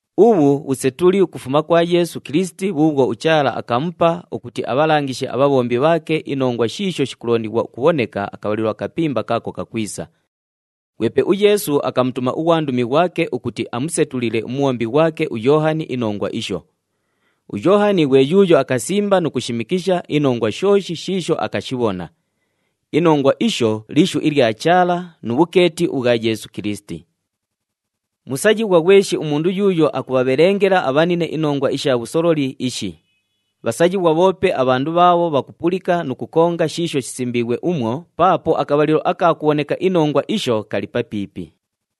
Ubhu bhusetuli ukufuma kwa Yeesu Kilisiti bhuubhwo uChaala akamupa ukuti abhalangishe abhabhombi bhaake inongwa shiisho shikulondighwa ukubhoneka akabhalilo akapimba kaako kakwisa. Ghwepe uYeesu akamutuma ughwandumi ghwake ukuti amusetulile umubhombi ghwake uYoohani inongwa isho. UYoohani ghwe yuuyo akasimba nu kushimikisha inongwa shooshi shiisho akashibhona. Inongwa isho lishu ilya Chaala nu bhukeeti ubhwa Yeesu Kilisiti. Musayighwa ghweshi umundu yuuyo akubhabhelengela abhanine inongwa isha bhusololi ishi. Bhasayighwa bhoope abhandu bhaabho bhakupulika nu kukonga shiisho shisimbiighwe umwo, paapo akabhalilo aka kubhoneka inongwa isho kali papiipi.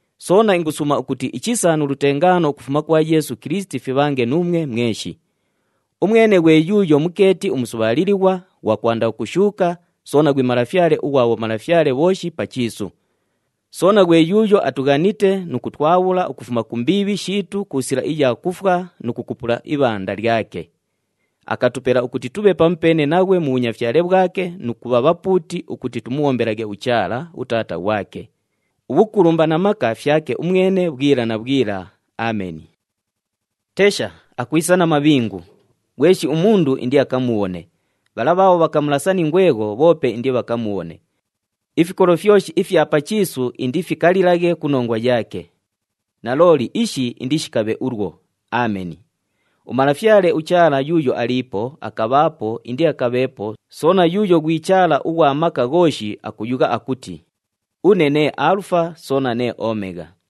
Soona ingusuuma ukuti ichisa nu lutengaano ukufuma kwa Yeesu Kilisiti fibhange nuumwe mweshi. Umwene ghwe yuuyo mukeeti umusubhaalilighwa, ghwa kwanda ukushuuka, soona ghwi Malafyale ughwa bhomalafyale bhooshi pa chiisu. Soona ghwe yuuyo atughanite nu kutwabhula ukufuma ku mbiibhi shiitu ku sila iya kufwa nu kukupula ibhanda lyake. Akatupela ukuti tubhe pamupeene naghwe mu bhunyafyale bhwake nu kubha bhapuuti ukuti tumubhombelaghe uChaala, uTaata ghwake. Ubhukulumba na maka fyake umwene bhwila na bhwila. Ameni. Tesha! Akwisa na mabhingu! Ghweshi umundu indiakamubhone. Bhala bhaabho bhakamulasa ni ngwegho, bhoope indibhakamubhone. Ifikolo fyoshi ifya pa chiisu indifikalilaghe ku nongwa yaake. Nalooli, ishi indishikabhe ulwo. Ameni. UMalafyale uChaala yuuyo aliipo, akabhaapo, indiakabheepo, soona yuuyo ghwi Chaala ughwa Maka Ghooshi akuyugha ukuti, “Une nee Aalufa soona nee Omegha.”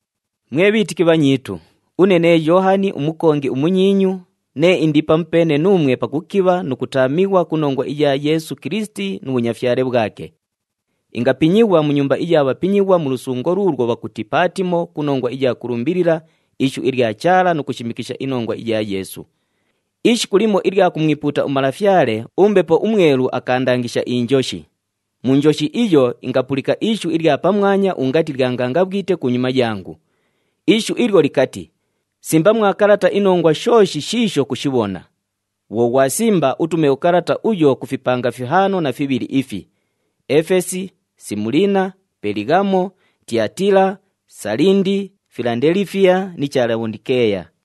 Mwe bhiitiki bhanyiitu, une nee Yoohani umukongi umunyiinyu, nee indi pamupeene nuumwe pakukibha nu kutaamighwa ku nongwa iya Yeesu Kilisiti nu bhunyafyale bhwake. Ingapinyighwa mu nyumba iya bhapinyighwa mu lusungo luulwo bhakuti Paatimo ku nongwa iya kulumbilila ishu ilya Chaala nu kushimikisha inongwa iya Yeesu. Ishiku limo ilya kumwipuuta uMalafyale, uMbepo uMwelu akaandangisha injoshi. Mu njoshi iyo, ingapulika ishu ilya pamwanya ungati lya ngangabhwite kunyuma yangu. Ishu ilyo likati, “Simba mwa kalata inongwa shooshi shiisho kushibhona. Bhwo ghwasimba, utume ukalata uyo ku fipanga fihaano na fibhili ifi: Efesi, Simuliina, Pelighamo, Tiyatiila, Salindi, Filandelifiya ni cha Labhondikeeya.”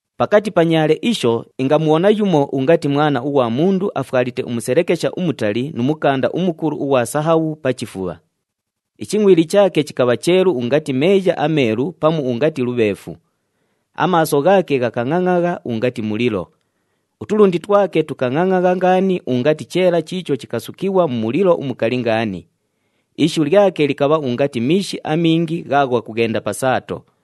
Pakati pa nyaale isho, ingamubhona yumo ungati Mwana ughwa Mundu afwalite umuselekesha umutali nu mukanda umukulu ughwa sahabhu pa chifubha. Ichingʼwili chaake chikabha cheelu ungati meeya ameelu pamu ungati lubheefu. Amaaso ghaake ghakangʼangʼagha ungati mulilo. Utulundi twake tukangʼangʼagha ngaani ungati cheela chiicho chikasukighwa mu mulilo umukali ngaani. Ishu lyake likabha ungati miishi amingi ghaagho ghakughenda pa saato.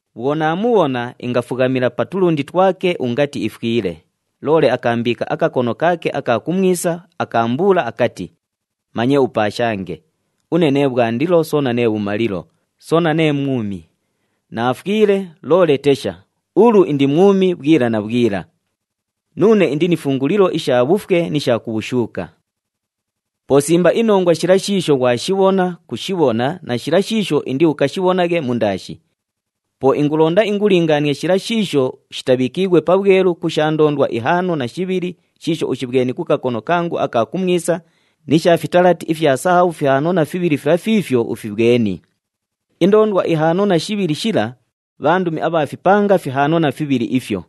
Bhwo naamubhona, ingafughamila pa tulundi twake ungati ifwile. Loole akaambiika akakono kaake aka kumwisa, akaambuula akati, “Manye upaashange! Une nee Bhwandilo soona nee Bhumalilo, soona nee Mwumi. Naafwile, loole tesha, ulu indi mwumi bhwila na bhwila! Nuune indi ni fungulilo isha bhufwe ni sha ku bhushuuka. “Po simba inongwa shila shiisho ghwashibhona, kushibhona na shila shiisho indiukashibhonaghe mundaashi. Po ingulonda ingulingaanie shila shiisho shitabhiikiighwe pabhwelu ku sha ndoondwa ihaano na shibhili, shiisho ushibhweni ku kakono kangu aka kumwisa ni sha fitalati ifya sahabhu fihaano na fibhili fila fiifyo ufibhweni. Indoondwa ihaano na shibhili shila, bhandumi abha fipanga fihaano na fibhili ifyo,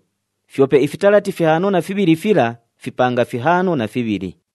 fyope ifitalati fihaano na fibhili fila, fipanga fihaano na fibhili.”